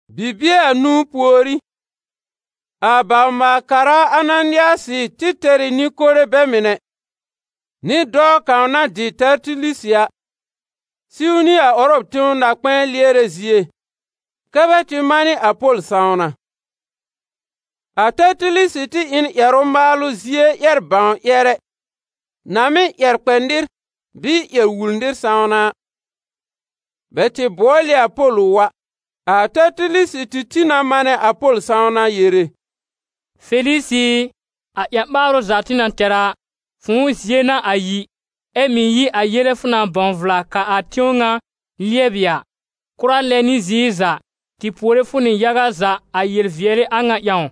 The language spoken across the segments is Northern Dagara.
Bibie anũu pùorí, a bawr-maal-kara Ananɩasɩ tɩ tɛr ɩ nɩ-kore bɛ mɩnɛ, nɩ dɔɔ kãw na dɩ Tɛrtilisɩ a, siw nɩ a Ʋrɔm tẽw na-kpɛ̃ɛ lɩɛrɛ zie kɛ́ bɛ tɩ manɩ a Pol sãwna. A Tɛrtilisɩ tɩ ɩ n ƴɛrʋ-maalʋ zie ƴɛr-bãw-ƴɛrɛ na mɩ́ ƴɛr kpɛ nɩr bɩɩ ƴɛr wul nɩr sãwna a. Bɛ tɩ bʋɔl ɩ a Pol ʋ wa. A Tɛrtilisɩ tɩ tĩ na manɛ a Pol sãwna yere: «Felisɩ ɩ, a ƴã-ɓaarʋ za tɩ na tɛr a, fʋ̃ʋ zie n'a a yi, ɛ mɩ̀ yi a yele fʋ na bãw vla kaa a tẽw ŋa lɩɛbɩ a. Kʋra lɛ nɩ ziir za, tɩ puore fʋ nɩ yaga za a yel-vɩɛlɩ a ŋa ƴãw.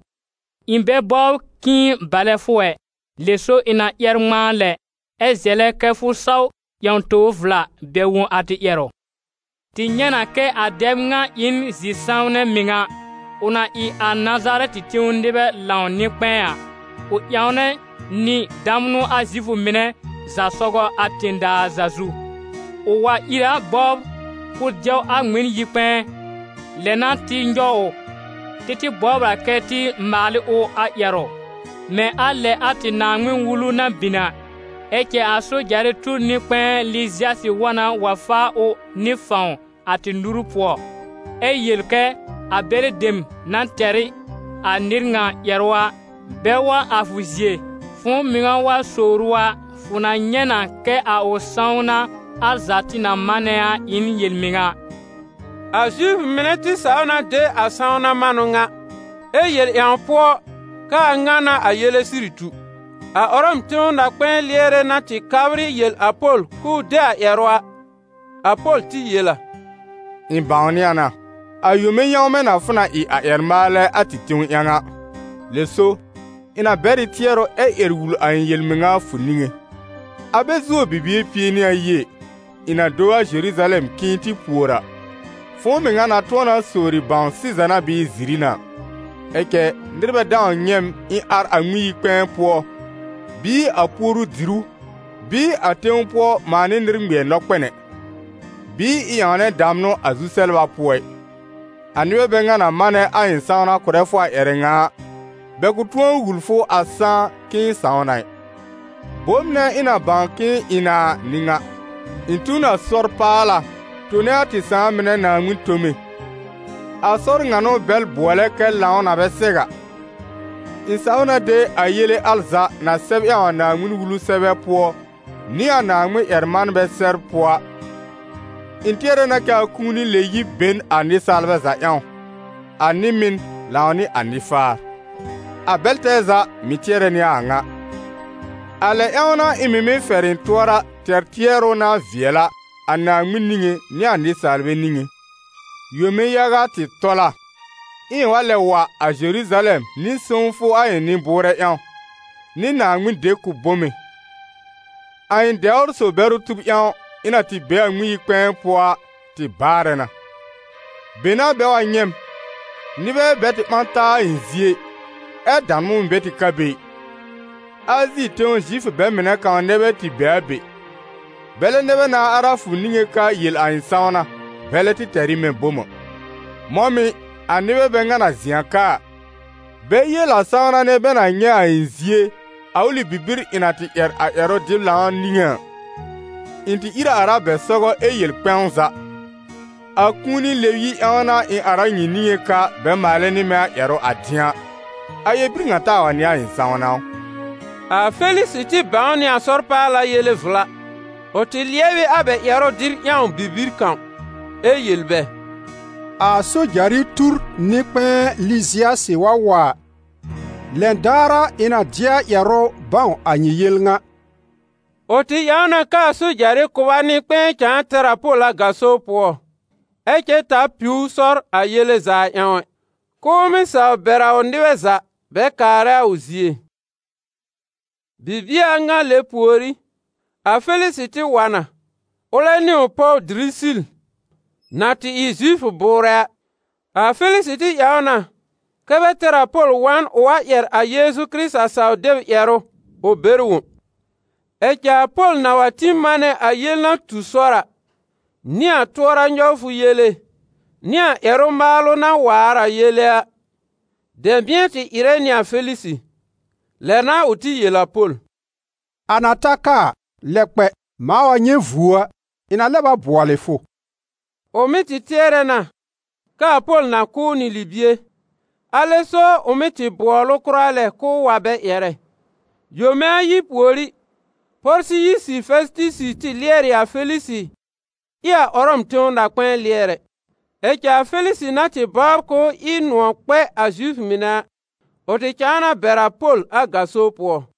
Ɩ̃ bɛ bɔbr k'ɩ̃ɩ balɛ fʋ ɛ. Lɛ so ɩ̃ na ƴɛr ŋmãa lɛ, ɛ zɛlɛ kɛ́ fʋ saw ƴãw tobr vla bɛr wõ a tɩ ƴɛrʋ. Tɩ nyɛ̃ na kɛ a dɛb ŋa ɩ n zi-sãwnɛ mɩŋa: ʋ na ɩ a Nazarɛtɩ tẽw nɩbɛ lãw nɩ-kpɛ̃ɛ a, ʋ ƴãwnɛ nɩ damnʋ a Zifʋ mɩnɛ za sɔgɔ a tẽ-daa za zu. Ʋ wa ìr a bɔbr k'ʋʋ dɛw a tɩ Ŋmɩn-yi-kpɛ̃ɛ. Lɛ n'a tɩ nyɔw ʋ. [Tɩ tɩ bɔbr a kɛ tɩ maal ɩ ʋ a ƴɛrʋ mɛ̃ a lɛ a tɩ Naaŋmɩn-Wulu na bin a. Ɛ cɛ a sojarɩ tur nɩ-kpɛ̃ɛ Lɩzɩasɩ wa na wa faa ʋ nɩ fãw a tɩ nuru pʋɔ, ɛ yel kɛ a bɛlɩ dem na tɛr ɩ a nɩr ŋa ƴɛrʋ a, bɛ wa a fʋ zie.] Fʋ̃ʋ mɩŋa wa sowr ʋ a, fʋ na nyɛ̃ na kɛ a ʋ sãwna al za tɩ na manɛ a ɩ n yel-mɩŋa.» A Zifʋ mɩnɛ tɩ saw na de a sãwna manʋ ŋa, ɛ yel ƴãw pʋɔ kɛ a ŋa n'a a yele sɩrɩ tu. A Ʋrɔm tẽw na-kpɛ̃ɛ lɩɛrɛ na tɩ kabr ɩ yel a Pol k'ʋʋ de a ƴɛrʋ a, a Pol tɩ yel a: «Ɩ̃ bãwnɩ a na, a yome yãwmɛ na fʋ na ɩ a ƴɛr-maalɛ a tɩ tẽw ƴãw a, lɛ so, ɩ̃ na bɛr ɩ tɩɛrʋ ɛ ƴɛr wul a ɩ̃ yel-mɩŋa a fʋ niŋé. A bɛ zuo bibie pie nɩ ayi ɛ, ɩ̃ na do a Zeruzalɛm k'ɩ̃ɩ tɩ pùor a, fʋ̃ʋ mɩŋa na tʋ̃ɔ na sowri bãw sɩza n'a bɩɩ ziri n'a. Ɛ cɛ nɩr bɛ dãw nyɛ̃ m ɩ̃ ar a Ŋmɩn-yi-kpɛ̃ɛ pʋɔ, bɩɩ a puoru-dìrú, bɩɩ a tẽw pʋɔ mãa nɩ nɩr ŋmɩɛr nɔkpɛn ɛ, bɩɩ ɩ̃ ƴãwnɛ damnʋ a zu-sɛbla pʋɔ ɩ. A nɩbɛ bɛ ŋa na manɛ a ɩ̃ sãwna kʋ̀rɛ fʋ a ƴɛrɛ ŋa a, bɛ kʋ̃ tʋ̃ɔ wul fʋ a sãá k'ɩ̃ɩ sãw na ɩ. Bom nɛ ɩ̃ na bãw k'ɩ̃ɩ ɩ na a n'ɩ ŋa: ɩ̃ tu n a Sɔr-paala, tone a tɩ sãà mɩnɛ Naaŋmɩn tome. A sɔr ŋa n'ʋ bɛl bʋɔlɛ kɛ lãw na bɛ sɛw a. Ɩ̃ saw na de a yele al za na sɛb ƴãw a Naaŋmɩn-Wulu sɛbɛ pʋɔ nɩ a Naaŋmɩn-ƴɛr-manbɛ sɛbr pʋɔ a. Ɩ̃ tɩɛrɛ na kɛ a kũuni lɛ-yib be n a nɩsaalbɛ za ƴãw, a nɩ-mɩn lãw nɩ a nɩ-faar. A bɛl tɛɛ za mɩ̀ tɩɛrɛ nɩ a a ŋa. A lɛ ƴãw n'a ɩ̃ mɩ̀ mɩ́ fɛr ɩ̃ tʋɔra tɛr tɩɛrʋ na vɩɛl a, a Naaŋmɩn niŋé nɩ a nɩsaalbɛ niŋé.» «Yome yaga tɩ tɔl a, ɛ ɩ̃ wa lɛb wa a Zeruzalɛm nɩ sõwfʋ a ɩ̃ nɩ-bʋʋrɛ ƴãw, nɩ Naaŋmɩn dekʋb-bome. A ɩ̃ dɛwr-so-bɛrʋ tub ƴãw, ɩ̃ na tɩ be a Ŋmɩn-yi-kpɛ̃ɛ pʋɔ a, tɩ baarɛ na. Be n'a bɛ wa nyɛ̃ m. Nɩbɛ bɛ tɩ ɓã taa a ɩ̃ zie ɩ, ɛ damnʋ mɩ̀ bɛ tɩ ka be ɩ. Azi tẽw Zifʋ bɛ mɩnɛ kãw nɛ bɛ tɩ be a be. Bɛlɛ nɛ bɛ nãa ar a fʋ niŋé ka yel a ɩ̃ sãwna, bɛlɛ tɩ tɛr ɩ mɛ̃ bom a. Mɔ̃ mɩ̀, a nɩbɛ bɛ ŋa na zɩ̃ a ka a, bɛ yel a sãwna nɛ, bɛ na nyɛ̃ a ɩ̃ zie a ʋlɩ bibir ɩ̃ na tɩ ƴɛr a ƴɛrʋ-dɩb-lãw niŋé a. Ɩ̃ tɩ ìr a ar a bɛ sɔgɔ ɛ yel kpɛ̃w za: ‹A kũuni lɛb-yib ƴãw n'a ɩ̃ ar a nyɩ niŋé ka bɛ maalɛ nɩ mɛ̃ ƴɛrʋ a dɩ̃a.› A ƴɛr-bir ŋa taa wa n'ɩ a ɩ̃ sãwna ʋ?» A Felisɩ tɩ bãw nɩ a Sɔr-paala yele vla. Ʋ tɩ lɩɛb ɩ a bɛ ƴɛrʋ dɩb ƴãw bibir kãw, ɛ yel bɛ: «A sojarɩ tur nɩ-kpɛ̃ɛ Lɩzɩasɩ wa wa a, lɛn daar a ɩ̃ na dɩ a ƴɛrʋ bãw a nyɩ yel ŋa.» Ʋ tɩ ƴãw na kɛ́ a sojarɩ kʋba nɩ-kpɛ̃ɛ cãa tɛr a Pol a gaso pʋɔ, ɛ cɛ ta piw ʋ sɔr a yele za ƴãw ɛ, k'ʋʋ mɩ́ saw bɛr a ʋ nɩbɛ za bɛ kaarɛ a ʋ zie. Bibie a ŋa lɛ pùorí, a Felisɩ tɩ wa na, ʋlɛ nɩ ʋ pɔw Dirisil, na tɩ ɩ Zifʋ bʋʋrɛ a. A Felisɩ tɩ ƴãw na kɛ́ bɛ tɛr a Pol wa n ʋ wa ƴɛr a Yeezu Kɩrɩta saw-deb ƴɛrʋ ʋ bɛr wõ. Ɛ cɛ a Pol na wa tĩ manɛ a yel na tu sɔr a, nɩ a tʋɔra nyɔwfʋ yele nɩ a ƴɛrʋ-maalʋ na waar a yele a, dɛ̃bɩ̃ɛ tɩ ɩrɛ nɩ a Felisɩ. Lɛ n'a ʋ tɩ yel a Pol: «A na ta ka a, lɛb kpɛ, mãa wa nyɛ̃ vuo a, ɩ̃ na lɛb a bʋɔlɩ fʋ.» Ʋ mɩ́ tɩ tɩɛrɛ na kɛ a Pol na kʋ̀ ʋ nɩ libie, alɛ so ʋ mɩ́ tɩ bʋɔl ʋ kʋra lɛ k'ʋʋ wa bɛ ƴɛrɛ. Yome ayi pùorí, Pɔrsɩyisi Fɛsɩtɩsɩ tɩ lɩɛr ɩ a Felisɩ ɩ a Ʋrɔm tẽw na-kpɛ̃ɛ lɩɛrɛ. Ɛ cɛ a Felisɩ na tɩ bɔbr k'ʋʋ ɩ nʋ̃ɔ̀ kpɛ a Zifʋ mɩnɛ a, ʋ tɩ cãa na bɛr a Pol a gaso pʋɔ.